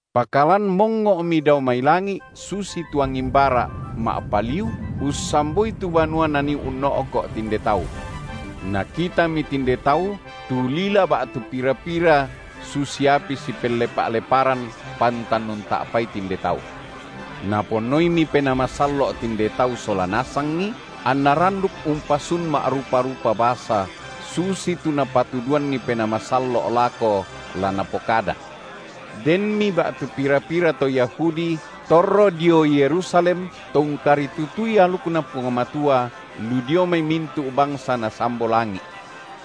Pakalan mongngo’mi dao mai langi’ susitu angin bara’ ma’paliu, ussamboi tu banua nanii unno’ko’ tinde tau. Nakitami tinde tau tu lila ba’tu pira-pira susi api sipellepa’-leparan, pantan unta’pai tinde tau. Naponnoimi Penaa Masallo’ tinde tau sola nasangi, anna randuk umpasun ma’rupa-rupa basa, susitu Napatuduanni Penaa Masallo’ lako la napokada. Denmi ba’tu pira-pira to Yahudi torro dio Yerusalem to ungkaritutui alukNa Puang Matua, lu dio mai mintu’ bangsa nasambo langi’.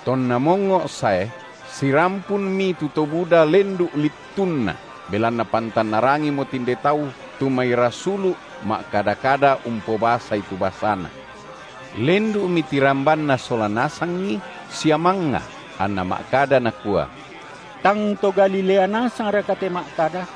Tonna mongngo’ sae, sirampunmi tu to buda lendu’ littunna, belanna pantan narangimo tinde tau tu mai rasulu’ ma’kada-kada umpobasai tu basana. Lendu’mi tirambanna sola nasangi sia mangnga, anna ma’kada nakua: Tang to Galilea nasangraka te ma’kada?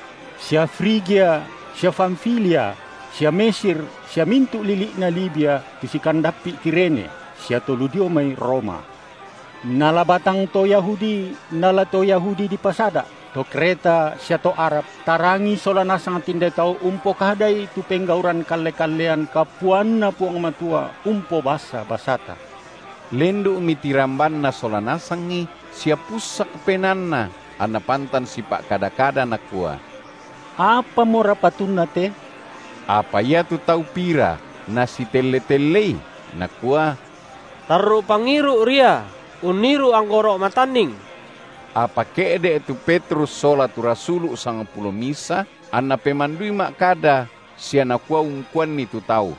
sia Frigia sia Pamfilia sia Mesir sia mintu’ lili’na Libia tu sikandappi’ Kirene, sia to lu dio mai Roma, nala batang to Yahudi nala to Yahudi dipasada’, to Kreta sia to Arab, tarangi sola nasang tinde tau umpokadai tu penggauran kalle-kallean kapuanNa Puang Matua umpobasa basata. Lendu’mi tirambanna sola nasangi sia pussak penaanna, anna pantan sipa’kada-kada nakua: Apamora patunna te? Apa iatu tau pira nasitelle-tellei, nakua: Tarru’ pangiru’ ria unniru’ anggoro’ matanning. Apa ke’de’ tu Petrus sola tu rasulu’ sangpulo misa, anna pemandui ma’kada sia nakua ungkuanni tu tau: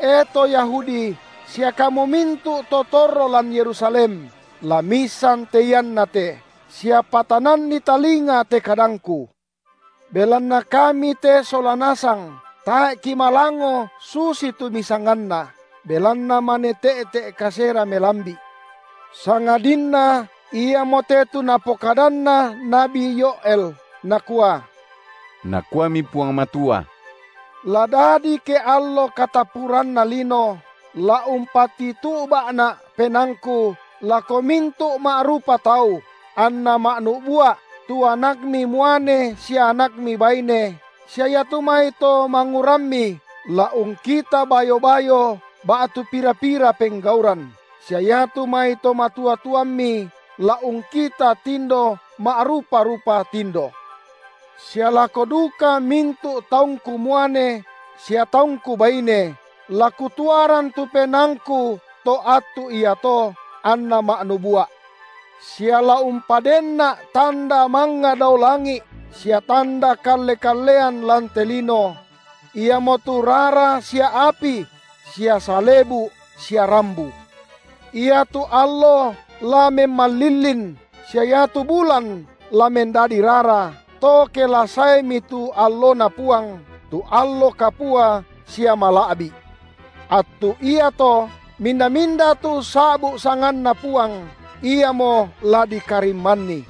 E to Yahudi sia kamu mintu’ to torro lan Yerusalem, la miissan te iannate, sia patananni talinga te kadangku! Belanna kami te sola nasang tae’ kimalango susitu misanganna, belanna mane te’te’ kasera melambi’; sangadinna iamote tu napokadanna nabi Yoël nakua: Nakuami Puang Matua: La dadi ke allo katappuranna lino, la umpatitu’ba’Na’ PenaangKu lako mintu’ ma’rupa tau, anna ma’nubua’ tu anakmi muane sia anakmi baine, sia iatu mai to mangurammi la ungkita bayo-bayo ba’tu pira-pira penggauran, sia iatu mai to matua-tuammi la ungkita tindo ma’rupa-rupa tindo, sia lako duka mintu’ taungKu muane sia taungKu baine la Kutuaran tu PenaangKu to attu iato, anna ma’nubua’. Sia la umpadenNa’ tanda mangnga dao langi’, sia tanda kalle-kallean lan te lino: iamotu rara sia api sia salebu’ sia rambu. Iatu allo la memmalillin, sia iatu bulan la mendadi rara, to ke la saemi tu alloNa Puang, tu allo kapua sia mala’bi’. Attu iato minda-minda tu ussa’bu’ sanganNa Puang, iamo la dikarimmanni.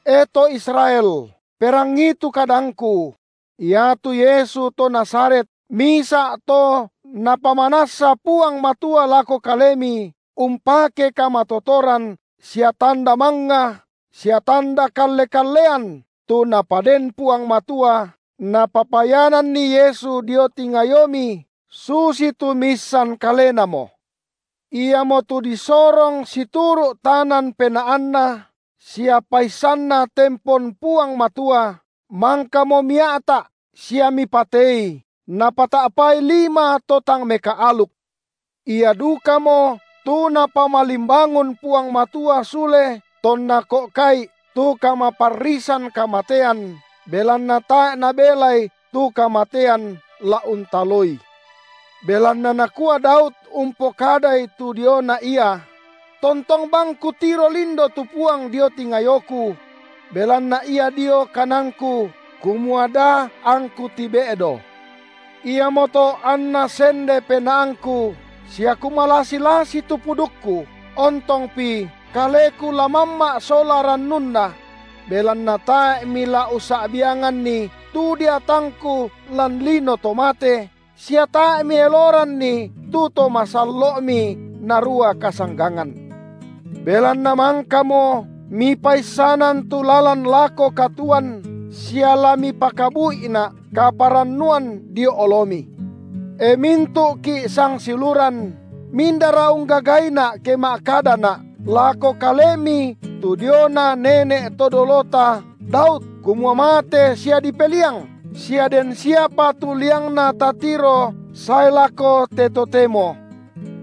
E to Israel, perangii tu kadangku: Iatu Yesu to Nazaret, misa’ To Napamanassa Puang Matua lako kalemi umpake kamatotoran sia tanda mangnga sia tanda kalle-kallean tu Napaden Puang Matua Napapayananni Yesu dio tingayomi, susitu miissan kalenamo; Iamotu disorong situru’ tanan penaanNa sia paissanNa tempon Puang Matua, mangkamo mia’ta’ sia mipatei napata’pai lima to tang mekaaluk. Ia dukamo tu Napamalimbangun Puang Matua sule tonna ko’ka’i tu kamaparrisan kamatean, belanna tae’ nabelai tu kamatean la untaloI. Belanna nakua Daud umpokadai tu diona Ia: Tontong bang kutiro lindo tu Puang dio tingayoku; belanna Ia dio kananku, kumua da angku tibe’do. Iamoto anna sende penaangku, sia kumalasi-lasi tu pudukku, ontongpi kaleku la mamma’ sola rannunna; belanna tae’ Mila ussa’bianganni tu deatangku lan lino to mate, sia tae’ Mieloranni tu To masallo’Mi narua kasanggangan. Belanna mangkamo’ Mipaissanan tu lalan lako katuoan, sia la Mipakabu’ina’ kaparannuan dio oloMi. E mintu’ki’ sangsiuluran, mindara unggagaina’ ke ma’kadana’ lako kalemi tu diona nene’ to dolota Daud, kumua mate sia dipeliang, sia den siapa tu liangna tatiro sae lako te totemo.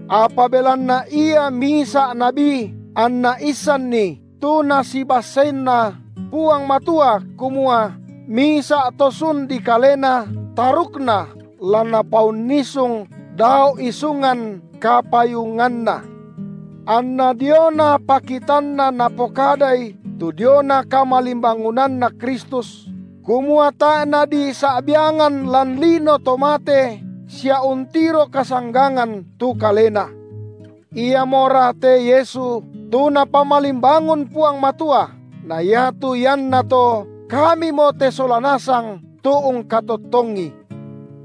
Apa belanna ia misa’ nabi anna issanni tu Nasibasseinna Puang Matua kumua misa’ to sun dikalena, tarukna la Napaunnisung dao isungan kapayunganNa, anna diona pakitanna napokadai tu diona kamalimbangunNa Kristus, kumua tae’ Nadisa’biangan lan lino to mate, sia untiro kasanggangan tu kaleNa. Iamora te Yesu tu Napamalimbangun Puang Matua, na iatu iannato kamimo te sola nasang tu ungkatottongi.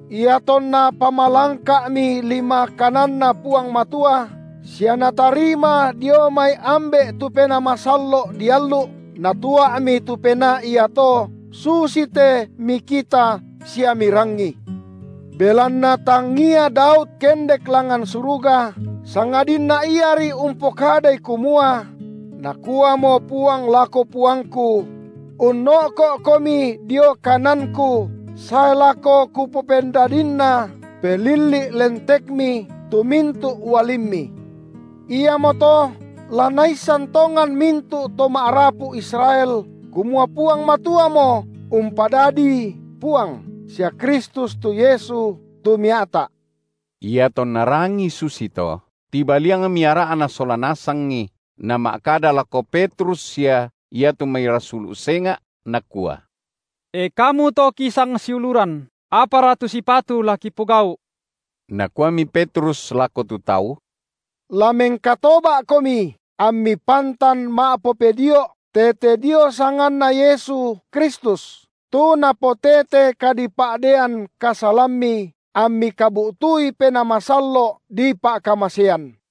Iatonna pamalangka’mi lima kananNa Puang Matua sia Natarima dio mai Ambe’ tu Penaa Masallo’ diallu’, Natua’mi tu Penaa iato susite mikita sia mirangi. Belanna tangia Daud kendek langngan suruga, sangadinna iari umpokadai kumua: Nakuamo Puang lako Puangku: Unno’ko’Komi dio kananKu, sae lako Kupopendadinna pelilli’ lentekMi tu mintu’ ualimMi. Iamoto la naissan tongan mintu’ to ma’rapu Israel kumua Puang Matuamo umpadadiI Puang sia Kristus tu Yesu, tu mia’ta’. Iatonna rangii susito, tibaliangmi ara’na sola nasangi nama’kada lako Petrus sia iatu mai rasulu’ senga’, nakua: E kamu to kisangsiuluran, apara tu sipatu la kipogau’? Nakuami Petrus lako tu tau: La mengkatoba’komi ammi pantan ma’popedio’ tete dio sanganNa Yesu Kristus tu napotete kadipa’deian kasalammi, ammi kabu’tui Penaa Masallo’ dipa’kamasean.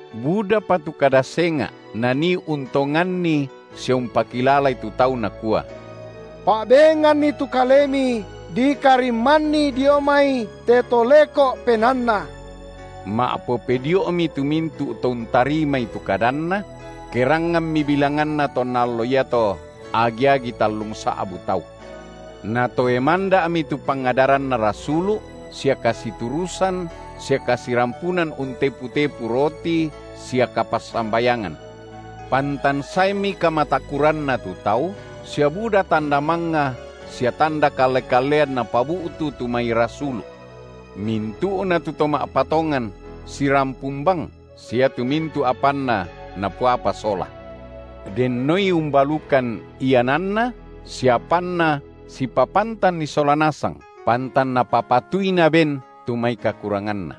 Budapa tu kada senga’ nanii untonganni sia umpakilalai tu tau nakua: Pa’benganni tu kalemi dikarimmanni dio mai te to leko’ penaanna. Ma’popedio’mi tu mintu’ to untarimai tu kadanna; keranganmi bilanganna tonna allo iato agi-agi tallungsa’bu tau. Natoe manda’mi tu pangadaranna rasulu’, sia kasiturusan, sia kasirampunan untepu-tepu roti sia kapassambayangan. Pantan saemi kamatakuranna tu tau, sia buda tanda mangnga sia tanda kalle-kallean napabu’tu tu mai rasulu’. Mintu’na tu to ma’patongan sirampun bang, sia iatu mintu’ apanna napoapa sola. Dennoi umbalukan iananna sia apanna sipapantanni sola nasang, pantan napapatui naben tu mai kakuranganna.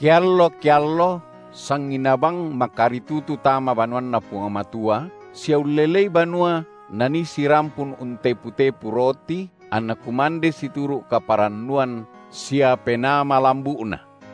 Keallo-keallo sanginaa bang makaritutu tama banuanNa Puang Matua, sia ullelei banua nanii sirampun untepu-tepu roti, anna kumande situru’ kaparannuan sia penaa malambu’na,